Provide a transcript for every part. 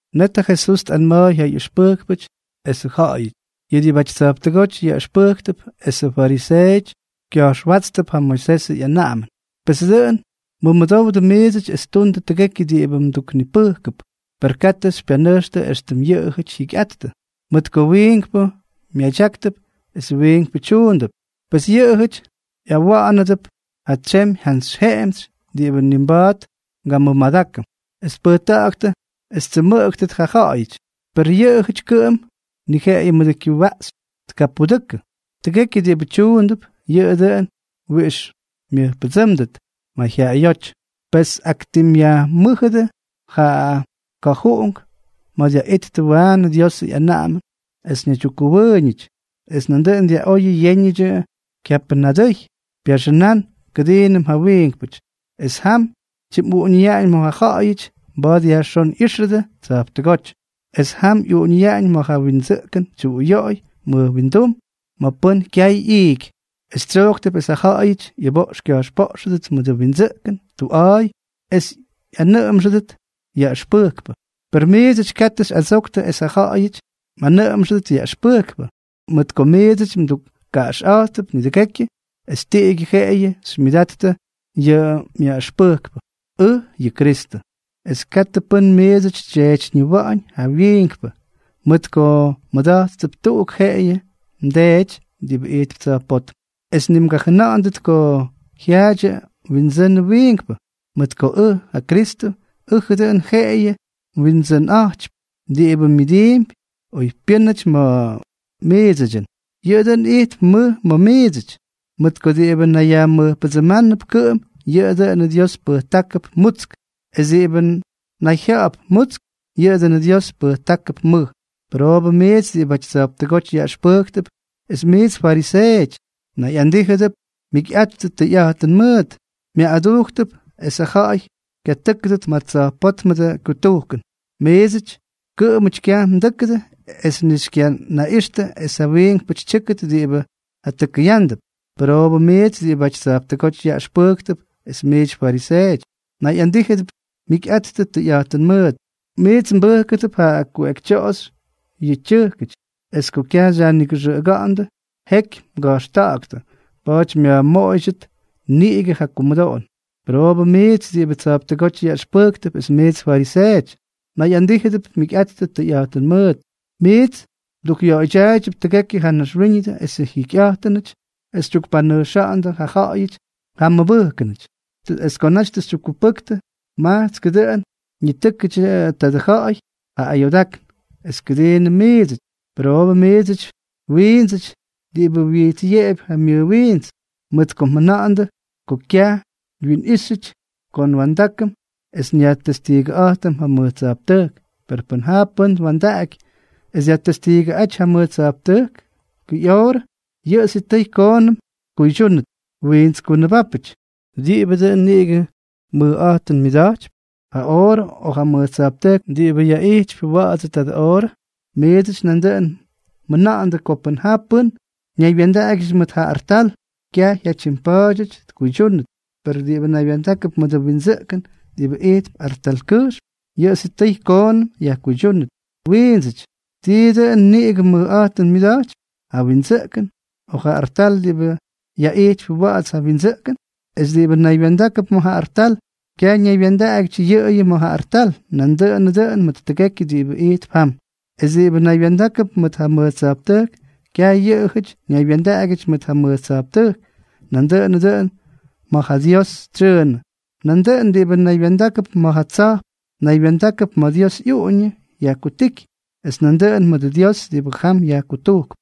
Net ja Jesús tꞌanma̱a̱y ja ꞌyʉxpʉjkpʉty esʉ ja̱ꞌa̱yʉty: —Yʉ diꞌibʉty tsa̱jptʉgóty yaꞌʉxpʉjktʉp esʉ fariseeʉty kya̱jxwátstʉp ja Moisesʉ ꞌyanaꞌamʉn. Pes dʉꞌʉn mʉmʉdowdʉ miidsʉty es tundʉ tʉgekyʉ diꞌibʉ mduknipʉjkʉp; per katʉ xypyanʉjxtʉ éxtʉm yʉꞌʉjʉty jyikyꞌattʉ, mʉt ko wiinkpʉ myadyáktʉp es wiinkpʉ tyuundʉp. Pes yʉꞌʉjʉty ꞌyawʉꞌʉndʉp ja tsemy jantsy jemtsy diꞌibʉ ni mba̱a̱t ngamʉmadákʉm, es tpʉjta̱ꞌa̱ktʉ es ttsʉmʉꞌʉktʉt ja ja̱ꞌa̱yʉty, per yʉꞌʉjʉty kʉꞌʉm ni jeꞌeyʉ mʉdʉ kyʉwaꞌxy tkapudʉkʉ. Tʉgekyʉ diꞌibʉ tyuundʉp, yʉꞌʉ dʉꞌʉn wiꞌix myʉjpʉdsʉ́mdʉt mayjyaꞌayóty. Pes tꞌaktimꞌyajmʉ́jʉdʉ ja ka̱juꞌunk ma̱ dyaꞌittʉ waanʉ Diosʉ ꞌyanaꞌamʉn es ñaydyukwimbokmʉwʉʉñʉty es ñaydyukkʉwʉʉñʉty, es nandʉꞌʉn dyaꞌóyʉdʉ yéñʉdyʉ kyapyʉ pyadʉy pyaxʉnán kʉdiinʉm ja wiinkpʉty, es jam tyimꞌuꞌuñʉyaꞌañ ma̱ ja ja̱ꞌa̱yʉty mba̱a̱t yajxón ꞌyíxʉdʉ tsa̱jptʉgóty, es jam ꞌyuꞌuñʉyaꞌañ ma̱ yʉ windsʉꞌkʉn tyuꞌuyoꞌoy mʉj windum ma̱ pʉ́n kyay ꞌyiiky, es tsyojktʉp es ja ja̱ꞌa̱yʉty ꞌyʉboꞌx kya̱jxpoꞌxʉdʉt mʉdʉ windsʉꞌkʉn tuꞌa̱a̱y es ꞌyanʉꞌʉmxʉdʉt yaꞌʉxpʉjkpʉ. ’Per miidsʉty katʉ xyꞌadsoktʉ es ja ja̱ꞌa̱yʉty mꞌanʉꞌʉmxʉdʉt yaꞌʉxpʉjkpʉ, mʉt ko miits mdukkaꞌaxꞌa̱jttʉp nidʉgekyʉ es tiꞌigyʉ jeꞌeyʉ xymyʉdattʉ yʉ mYaꞌʉxpʉjkpʉ, ʉj, yʉ Kristʉ. Es katʉ pʉ́n miidsʉty xytyeetyñiwa̱ꞌa̱ñ ja wiinkpʉ, mʉt ko mmʉda̱jttʉp tuꞌuk jeꞌeyʉ mDeedyʉty diꞌibʉ ijtp tsa̱jpótm. Es ni mgajʉna̱ꞌa̱ndʉt ko jyaadyʉ mwindsʉnʉ wiinkpʉ, mʉt ko ʉj, ja Kristʉ, ʉjʉ dʉꞌʉn jeꞌeyʉ mWindsʉnꞌa̱jtypy. Diꞌibʉ myʉdiimpy oypyʉ́nʉty ma̱ miidsʉdyʉn, yʉꞌʉ dʉꞌʉn ijtp mʉj ma̱ miidsʉty. Mʉt ko diꞌibʉ nayyajmʉjpʉdsʉʉmʉp kʉꞌʉm, yʉꞌʉ dʉꞌʉnʉ Dios pʉjtákʉp mutsk; es diꞌibʉ nayjya̱ꞌa̱p mutsk, yʉꞌʉ dʉꞌʉnʉ Dios pʉjtákʉp mʉj. ’¡Pʉroobʉ miits diꞌibʉty tsa̱jptʉgóty yaꞌʉxpʉjktʉp es miits fariseeʉty, mnayꞌandíjʉdʉp mjikyꞌattʉ tʉyꞌa̱jtʉn mʉʉt! Myaꞌꞌadujktʉp esʉ ja̱ꞌa̱y kyatʉ́kʉdʉt ma̱ tsa̱jpótmʉdʉ kutujkʉn. Miidsʉty kʉꞌʉmʉty kyaj mdʉ́kʉdʉ es ni xykyanaꞌixtʉ es ja wiinkpʉty tyʉ́kʉdʉt diꞌibʉ jatʉkʉyándʉp. ’¡Pʉroobʉ miits diꞌibʉty tsa̱jptʉgóty yaꞌʉxpʉjktʉp es miits fariseeʉty, mnayꞌandíjʉdʉp mjikyꞌattʉ tʉyꞌa̱jtʉn mʉʉt! Miits mbʉjkʉdʉp ja kuꞌekytyoꞌoxy yʉ tyʉjkʉty, es ko kyaj xyajnigʉxʉꞌʉga̱ꞌa̱ndʉ, jeky mga̱jxta̱ꞌa̱ktʉ. Pa̱a̱ty myajmoꞌoydyʉt niꞌigʉ ja kumʉdoꞌon. ’¡Pʉroobʉ miits diꞌibʉty tsa̱jptʉgóty yaꞌʉxpʉjktʉp es miits fariseeʉty, mnayꞌandíjʉdʉp mjikyꞌattʉ tʉyꞌa̱jtʉn mʉʉt! Miits mdukꞌyoꞌoydyaaydyʉp tʉgekyʉ ja naxwíñʉdʉ esʉ jikymyejyñʉty es xytyukpanʉjxa̱ꞌa̱ndʉ ja ja̱ꞌa̱yʉty ja mmʉbʉjkʉnʉty, es ko naty tʉ xytyukkupʉktʉ, majtskʉ dʉꞌʉn ñitʉ́kʉdyʉ tadʉ ja̱ꞌa̱y ja ayoodákn es kʉdiinʉm miidsʉty. ¡Pʉroobʉ miidsʉty, wiindsʉty diꞌibʉ wyijtsꞌyeꞌepy ja myʉwiints!, mʉt ko mjʉna̱ꞌa̱ndʉ ko kyaj tyimwiꞌixʉty ko nwa̱ndákʉm es nyajtestiigʉꞌa̱jtʉm ja mʉj tsa̱jptʉjk; per pʉn ja pʉ́n twa̱ndaꞌaky es dyajtestiigʉꞌáty ja mʉj tsa̱jptʉjkʉ ꞌyoorʉ, yʉꞌʉ sitʉy koonʉm tkuydyúnʉt. ¡Wiints kunʉbápʉty! ¿Tiibʉ dʉn niꞌigʉ mʉjꞌa̱jtʉn myʉda̱jtypy? ¿Ja oorʉ o ja mʉj tsa̱jptʉjk diꞌibʉ yaꞌijtypy wa̱ꞌa̱ts tadʉ oorʉ? ’Miidsʉty nandʉꞌʉn mjʉna̱ꞌa̱ndʉ ko pʉn ja pʉ́n ñaywya̱ndaꞌagyʉty mʉt ja artal, kyaj jyatyimpa̱a̱dyʉty tkuydyúndʉt; per diꞌibʉ naywya̱ndákʉp mʉdʉ windsʉꞌkʉn diꞌibʉ ijtp artalkʉjxm, yʉꞌʉ sitʉy koonʉm yajkuydyúnʉt. ¡Wiindsʉty! ¿Tiibʉ dʉn niꞌigʉ mʉjꞌa̱jtʉn myʉda̱jtypy, ja windsʉꞌkʉn, o ja artal diꞌibʉ yaꞌijtypy wa̱ꞌa̱ts ja windsʉꞌkʉn? Es diꞌibʉ naywya̱ndákʉp ma̱ ja artal, kyaj ñaywya̱ndaꞌagyʉty yʉꞌʉyʉ ma̱ ja artal, nandʉꞌʉnʉ dʉꞌʉn mʉt tʉgekyʉ diꞌibʉ ijtp jam. Es diꞌibʉ naywya̱ndákʉp ma̱ ja mʉj tsa̱jptʉjk, kyaj yʉꞌʉjʉty ñaywya̱ndaꞌagyʉty ma̱ ja mʉj tsa̱jptʉjk, nandʉꞌʉnʉ dʉꞌʉn ma̱ ja Dios tsyʉʉnʉ. Nandʉꞌʉn diꞌibʉ naywya̱ndákʉp ma̱ ja tsa̱jp, naywya̱ndákʉp ma̱ Dios ꞌyuꞌuñʉ yajkutíky, es nandʉꞌʉn mʉdʉ Dios diꞌibʉ jam yajkutujkp.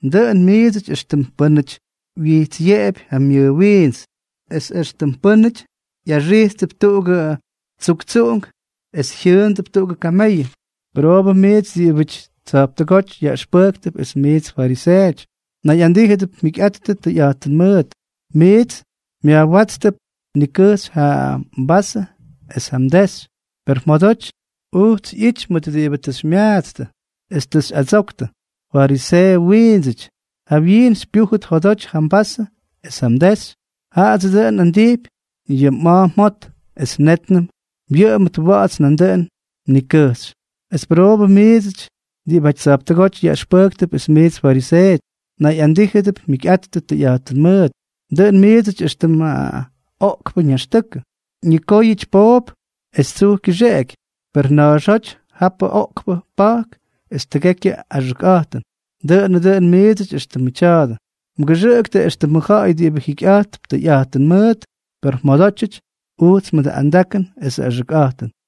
Dʉꞌʉn miidsʉty éxtʉm pʉ́nʉty wyijtsꞌyeꞌepy ja myʉwiints, es éxtʉm pʉ́nʉty ꞌyaxijttʉp tuꞌugʉ tsuktsuꞌunk es jyʉꞌʉndʉp tuꞌugʉ kameyʉ. ’¡Pʉroobʉ miits diꞌibʉty tsa̱jptʉgóty yaꞌʉxpʉjktʉp es miits fariseeʉty, mnayꞌandíjʉdʉp mjikyꞌattʉ tʉyꞌa̱jtʉn mʉʉt! Miits myajwátstʉp nikʉjxy ja mvasʉ es ja mdexy, per jyodoty ujts ꞌyity mʉt diꞌibʉ tʉ xymyaatstʉ es tʉ xyꞌadsoktʉ. ¡Fariseeʉ wiindsʉty! Jawyiin xypyújʉt jodoty ja mvasʉ es ja mdexy, jaꞌadsʉ dʉꞌʉn nꞌandijpy yʉ mꞌa̱a̱ mjot, es nétnʉm wyʉꞌʉmʉt wa̱ꞌa̱ts nandʉꞌʉn mnikʉjxy. ’¡Es pʉroobʉ miits diꞌibʉty tsa̱jptʉgóty yaꞌʉxpʉjktʉp es miits fariseeʉty, mnayꞌandíjʉdʉp mjikyꞌattʉ tʉyꞌa̱jtʉn mʉʉt! Dʉꞌʉn miidsʉty éxtʉm ma̱ oꞌkpʉ ñaxtʉkʉ. Ñikóyʉty poop es tsuj kyʉxeꞌeky, per na̱a̱xóty japʉ oꞌkpʉ pa̱jk es tʉgekyʉ axʉkꞌa̱jtʉn. Dʉꞌʉnʉ dʉn miidsʉty éxtʉmʉ tya̱a̱dʉ. Mgʉxʉꞌʉktʉ éxtʉmʉ ja̱ꞌa̱y diꞌibʉ jikyꞌa̱jtp tʉyꞌa̱jtʉn mʉʉt, per mjodótyʉty ujts mʉdʉ andakʉn esʉ axʉkꞌa̱jtʉn.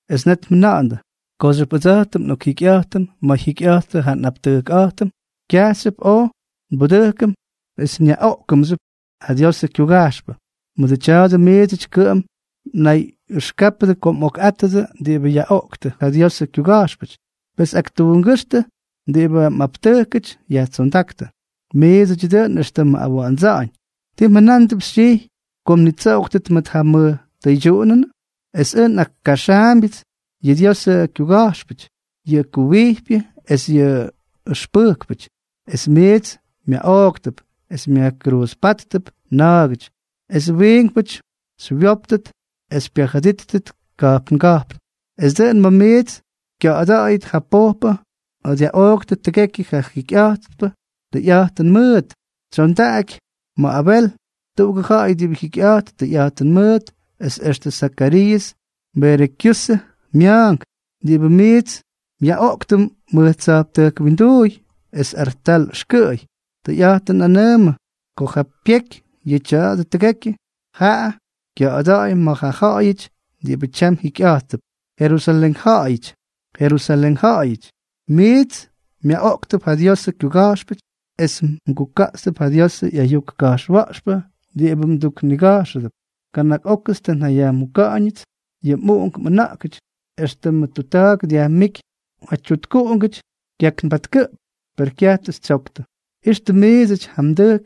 es net mjʉna̱ꞌa̱ndʉ: “Kooxyʉp ʉdsa̱jtʉm oj njikyꞌa̱jtʉm ma̱ jyikyꞌa̱jttʉ ja nꞌaptʉjkꞌa̱jtʉm, kyajxyʉp oj nbudʉjkʉm es nyaꞌoꞌkʉmxyʉp ja Diosʉ kyuga̱jxpʉty.” Mʉdʉ tya̱a̱dʉ miidsʉty kʉꞌʉm mnayꞌʉxkápʉdʉ ko mꞌokꞌátʉdʉ diꞌibʉ yaꞌoꞌktʉ ja Diosʉ kyuga̱jxpʉty. Pes aktuungʉ́xtʉ diꞌibʉ ja mꞌaptʉjkʉty yajtsondáktʉ. ’¡Miidsʉty dʉꞌʉn éxtʉmʉ awa̱ꞌa̱ndsa̱ꞌa̱ñʉn! ¿Tii mjʉnándʉp xytyijy ko mnitsoꞌoktʉt ma̱ ja mʉj tʉydyuꞌunʉn? Es ʉj nꞌakkaxaambyʉts yʉ Diosʉ kyuga̱jxpʉty, yʉ kuwijpyʉ es yʉ yaꞌʉxpʉjkpʉty, es miits myaꞌooktʉp es myajkruuzpáttʉp na̱a̱gʉty, esʉ wiinkpʉty xywyóptʉt es xypyajʉdíttʉt ka̱jpnga̱jpn. Es dʉꞌʉn ma̱ miits kya̱ꞌa̱da̱ꞌa̱yʉt ja pojpʉ ma̱ dyaꞌoꞌktʉ tʉgekyʉ ja jyikyꞌattʉ tʉyꞌa̱jtʉn mʉʉt, tsyondaꞌaky ma̱ Abel, tuꞌugʉ ja̱ꞌa̱y diꞌibʉ jikyꞌa̱jt tʉyꞌa̱jtʉn mʉʉt, es extʉ Zakariiʉs, Berekiiʉsʉ mya̱a̱nk, diꞌibʉ miits myaꞌoꞌktʉ mʉj tsa̱jptʉjk winduuy es artal ʉxkʉꞌʉy. Tʉyꞌa̱jtʉn nꞌanʉʉmʉ ko ja pyeky yʉ tya̱a̱dʉ tʉgekyʉ, jaa kya̱ꞌa̱da̱ꞌa̱y ma̱ ja ja̱ꞌa̱yʉty diꞌibʉ tyam jikyꞌa̱jttʉp. ’¡Jerusalén ja̱ꞌa̱yʉty, Jerusalén ja̱ꞌa̱yʉty, miits myaꞌoꞌktʉp ja Diosʉ kyuga̱jxpʉty es mguka̱ꞌtstʉp ja Diosʉ ꞌyayuk ka̱jxwa̱ꞌxpʉ diꞌibʉ mduknigajxʉdʉp! ¡Kana̱k ókʉts tʉ njayajmuka̱ꞌa̱ñʉts yʉ mꞌuꞌunk mꞌʉna̱ꞌkʉty, éxtʉmʉ tutta̱a̱k dyajmíky ja tyutkuꞌungʉty kyaknbatkʉꞌp, per kyaj tʉ xytsyoktʉ! Ixtʉ miidsʉty ja mdʉjk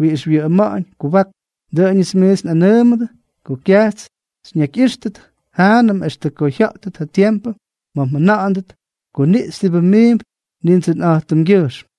wiꞌix wyʉꞌʉma̱ꞌa̱ñ kubak. Dʉꞌʉnʉts miits nꞌanʉʉmʉdʉ ko kyajts xyñakyꞌíxtʉt jaanʉm extʉ ko jya̱ꞌtʉt ja tiempʉ ma̱ mjʉna̱ꞌa̱ndʉt: “Kuniꞌxy diꞌibʉ miimp Nindsʉnꞌa̱jtʉmgyʉjxm.”